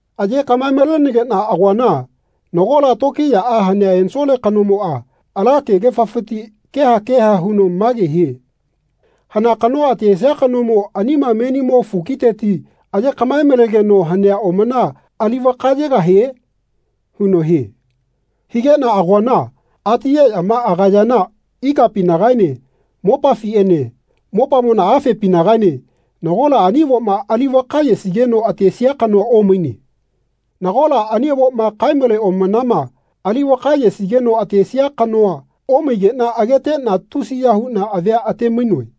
Aye kaꞌmae-malenegeꞌna agoana nagola tokiyaꞌa hanea ensole kanomoꞌa ala kegefafiti keha keha huno mage hie “Hana kanoa atesia kanomo anima menimo fukiteti aye kaꞌmae-malegeno hanea omana ali vaka yegahie?” huno hie. Higeꞌna agoana atiyeꞌyama agayana ikapinagaene mopafiꞌene mopamona afepinagaene nagola ani avoma ali vaka yesigeno atesia kanoa omaine. Nagola ani avoma kae-male omanama ali vaka yesigeno atesia kanoa omaigeꞌna ageteꞌna tusiya huꞌna avia ate-mainoe.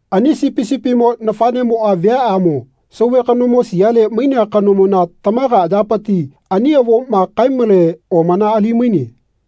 Ani Sipi sipimo nafaꞌnemoꞌa viaꞌamo sauve kanomo siale mainea kanomona tamaga ayapiti ani avoma kae-male omana ali-maine.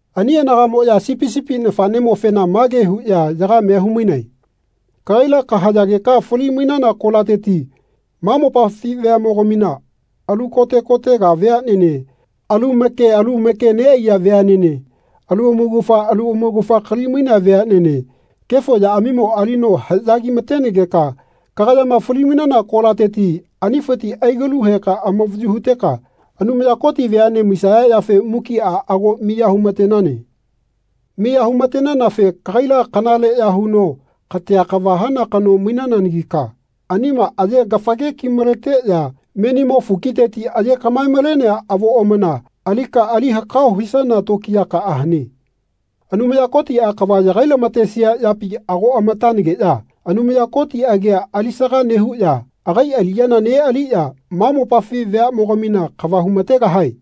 Ani anagaꞌmoꞌya Sipi sipi nafaꞌnemofena mage huꞌya yagamea humainae “Kagaila kahayageka fali-mainana kolateti ma mopafi veaꞌmogamina, alu kote kotega veaꞌnene, alu make alu make neꞌaiya veaꞌnene, alu amaugafa alu amaugafa kalimainea veaꞌnene, kefo yaꞌamimo alino haꞌyagimatenegeka kagayama fali-mainana kolateti anifiti aligalu heka amavayu huteka Anumaya Koti veaꞌne maisaya yafe mukiꞌa ago miya humatenane. Miya humatenanafe kagaila kanale ya huno katea kava hana kano mainananagika anima aye-gafage ki-maleteꞌya menimo fukiteti aye kaꞌmae-malenea avo omana alika ali hakao hisana tokiyakaꞌa hane. Anumaya Kotiꞌa kava yagai-lamatesia yapi ago amatanageꞌya Anumaya Koti agia alisaga nehuꞌya agai aliꞌyana neꞌaliꞌya ma mopafi veaꞌmogamina kava humategahae.”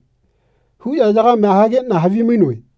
huꞌya yagamea hageꞌna havimainoe.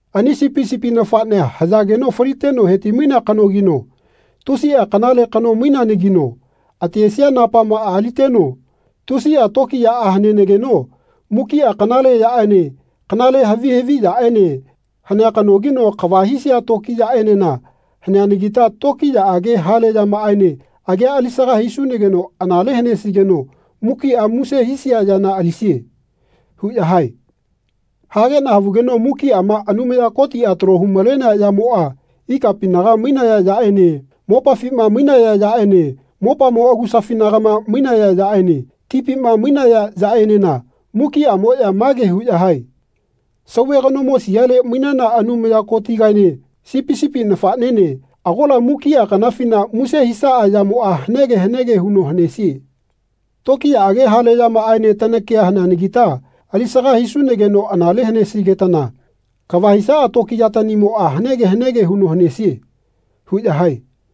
“Ani Sipi sipi nafaꞌnea hayageno faliteno heti-mainea kanogino tusiꞌa kanale kano maineanagino atesia napamaꞌa aliteno tusiꞌa tokiyaꞌa hanenageno mukiꞌa kanale yaꞌene kanale havi haviꞌyaꞌene hanea kanogino kava hisia tokiyaꞌaenena haneanagita tokiyaꞌage hale yamaene agia alisaga hisunageno anale hanesigeno mukiꞌa muse hisia yana alisie.” huꞌya hae. Hageꞌna havugeno mukiꞌama Anumaya Kotiꞌa talo humalenea yamoꞌa ikapinaga mainaya yaꞌene mopafima mainaya yaꞌene mopamo agusafinagama mainaya yaꞌene tipima mainaya yaꞌenena mukiꞌamoꞌya mage huꞌya hae “Sauve kanomo siale mainana Anumaya Kotigaene Sipi sipi nafaꞌnene agola mukiꞌa kanafina muse hisaꞌa yamoꞌa hanege hanege huno hanesie. Tokiyaꞌage hale yamaꞌaene tanakia haneanagita alisaga hisunageno anale hanesigetana kava hisaꞌa tokiyatanimoꞌa hanege hanege huno hanesie.” huꞌya hae.